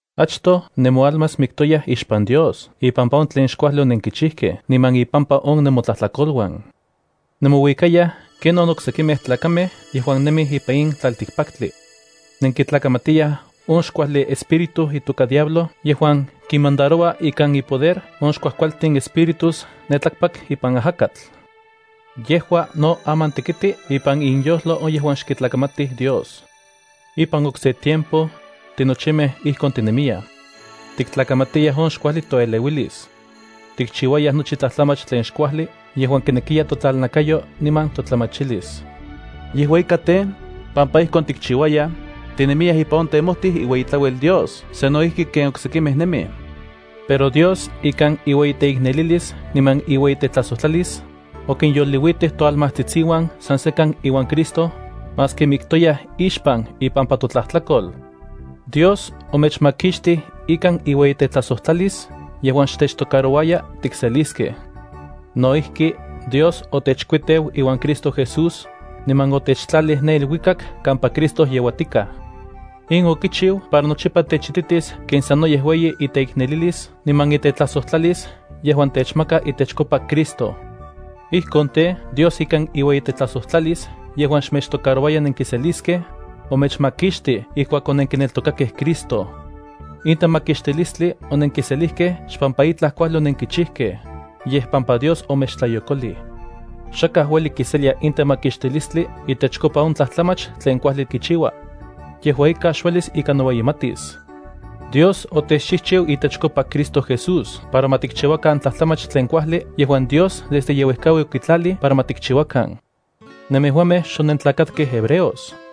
Achtoj, nemoalmas miktoyaj ixpan Dios ipampa on tlen xkuajli onenkichijkej niman ipampa on nemotlajtlakoluan. Nemouikayaj ken on oksekimej tlakamej yejuan nemij ipan in tlaltikpaktli. Nenkitlakamatiyaj on xkuajli espíritu itoka diablo yejuan kinmandaroua ikan ipoder on xkuajkualtin espíritus ne tlakpak ipan ajakatl. Yejua no aman tekiti ipan inyojlo on yejuan xkitlakamatij Dios. Ipan okse tiempo, tinochimej ijkon tinemiyaj. Tiktlakamatiyaj on xkuajli toeleuilis. Tikchiuayaj nochi tlajtlamach tlen xkuajli yejuan kinekiya totlalnakayo niman totlamachilis. Yejua ika tej, pampa ijkon tikchiuayaj, timemiyaj ipan on temojtij iueyitlauel Dios sano ijki ken oksekimej nemij. Pero Dios ikan iueyiteiknelilis niman iueyitetlajsojtlalis okinyoliuitij toalmajtsitsiuan san sekan iuan Cristo, maski miktoyaj ixpan ipampa totlajtlakol. Dios omechmakixtij ikan iueyitetlajsojtlalis yejuan xtechtocarouaya tikseliskej. No ijki Dios otechkuiteu iuan Cristo Jesús, niman otechtlalij ne iluikak kampa Cristo yeuatikaj. In okichiu para nochipa techititis ken sanoyej ueyi iteiknelilis niman itetlajsojtlalis yejuan techmaka itechkopa Cristo. Ijkon tej, Dios ikan iueyitetlajsojtlalis yejuan xmechtocarouaya nenkiseliskej, omechmakixtij ijkuak onenkineltokakej Cristo. In temakixtilistli onenkiselijkej xpampa itlaj kuajli onenkichijkej, yej pampa Dios omechtlayokolij. Xakaj ueli kiselia in temakixtilistli itechkopa on tlajtlamach tlen kuajli kichiua. Yejua ika xuelis ika noueyimatis. Dios otechchijchiu itechkopa Cristo Jesús para ma tikchiuakan tlajtlamach tlen kuajli yejuan Dios desde ye uejkaui okitlalij para ma tikchiuakan. Nemejuamej xonentlakatkej hebreos.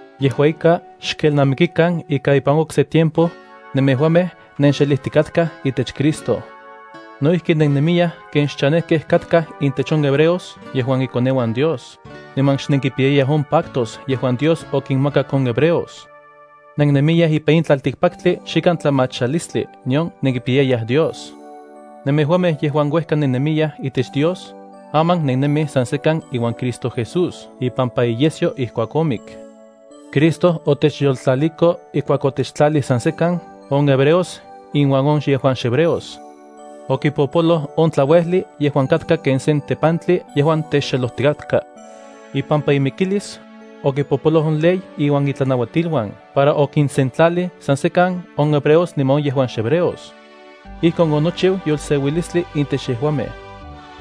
Yejua ika, xkelnamikikan ika ipan okse tiempo, nemejuamej nenxelijtikatkaj itech Cristo. No ijki nennemiyaj ken xchanejkej katkaj intech on hebreos yejuan ikoneuan Dios, niman xnenkipiyayaj on pactos yejuan Dios okinmakak on hebreos. Nennemiyaj ipan in tlaltikpaktli xikan tlamachalistli nion xnenkipiyayaj Dios. Nemejuamej yejuan uejka nennemiyaj itech Dios, aman nennemij san sekan iuan Cristo Jesús ipampa iyesyo ijkuak omik. Cristo otechyoltlaliko ijkuak otechtlalij san sekan on hebreos inuan on yejuan xhebreos. Okipopoloj on tlauejli yejuan katka ken sen tepantli yejuan techxelojtikatka. Ipampa imikilis, okipopoloj on ley iuan itlanauatiluan para okinsentlalij san sekan on hebreos niman on yejuan xhebreos. Ijkon onochiu yolseuilistli intech yejuamej.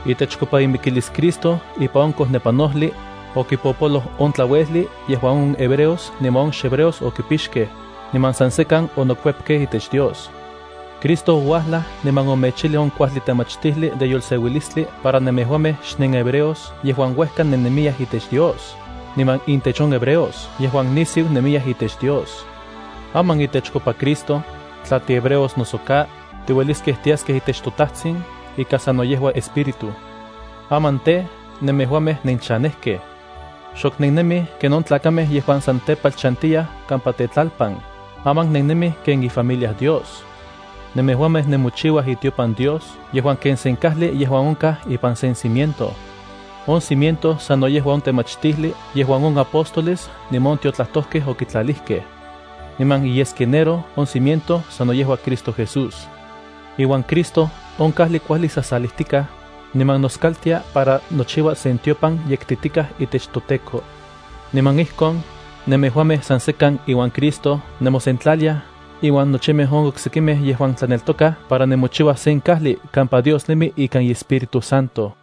Itechkopa imikilis Cristo ipan on kojnepanojli, okipopoloj on tlauejli yejuan on hebreos niman on xhebreos okipixkej, niman san sekan onokuepkej itech Dios. Cristo ouajlaj niman omechijlij on kuajli temachtijli de yolseuilistli para nemejuamej xnenhebreos yejuan uejka nennemiyaj itech Dios, niman intech on hebreos yejuan nisiu nemiyaj itech Dios. Aman itechkopa Cristo, tla tihebreos noso ka, tiueliskej tiaskej itech toTajtsin ikan sanno yejua Espíritu. Aman tej, nemejuamej nenchanejkej. Xok nennemij ken on tlakamej yejuan san tepal chantiyaj kampa tetlalpan. Aman nennemij ken ifamilia Dios. Nemejuamej nemochiuaj itiopan Dios yejuan ken sen kajli yejuan onkaj ipan sen cimiento. On cimiento sano yejua on temachtijli yejuan on apóstoles niman on tiotlajtojkej okitlalijkej. Niman iesquineroj on cimiento sano yejua Cristo Jesús. Iuan Cristo on kajli kuajli sasalijtikaj, niman noskaltia para nochiua sen tiopan yektitikaj itech toTEKO. Niman ijkon, nemejuamej san sekan iuan Cristo nemosentlaliaj iuan nochimej on oksekimej yejuan tlaneltokaj para nemochiuaj sen kajli kampa Dios nemi ikan iEspíritu Santo.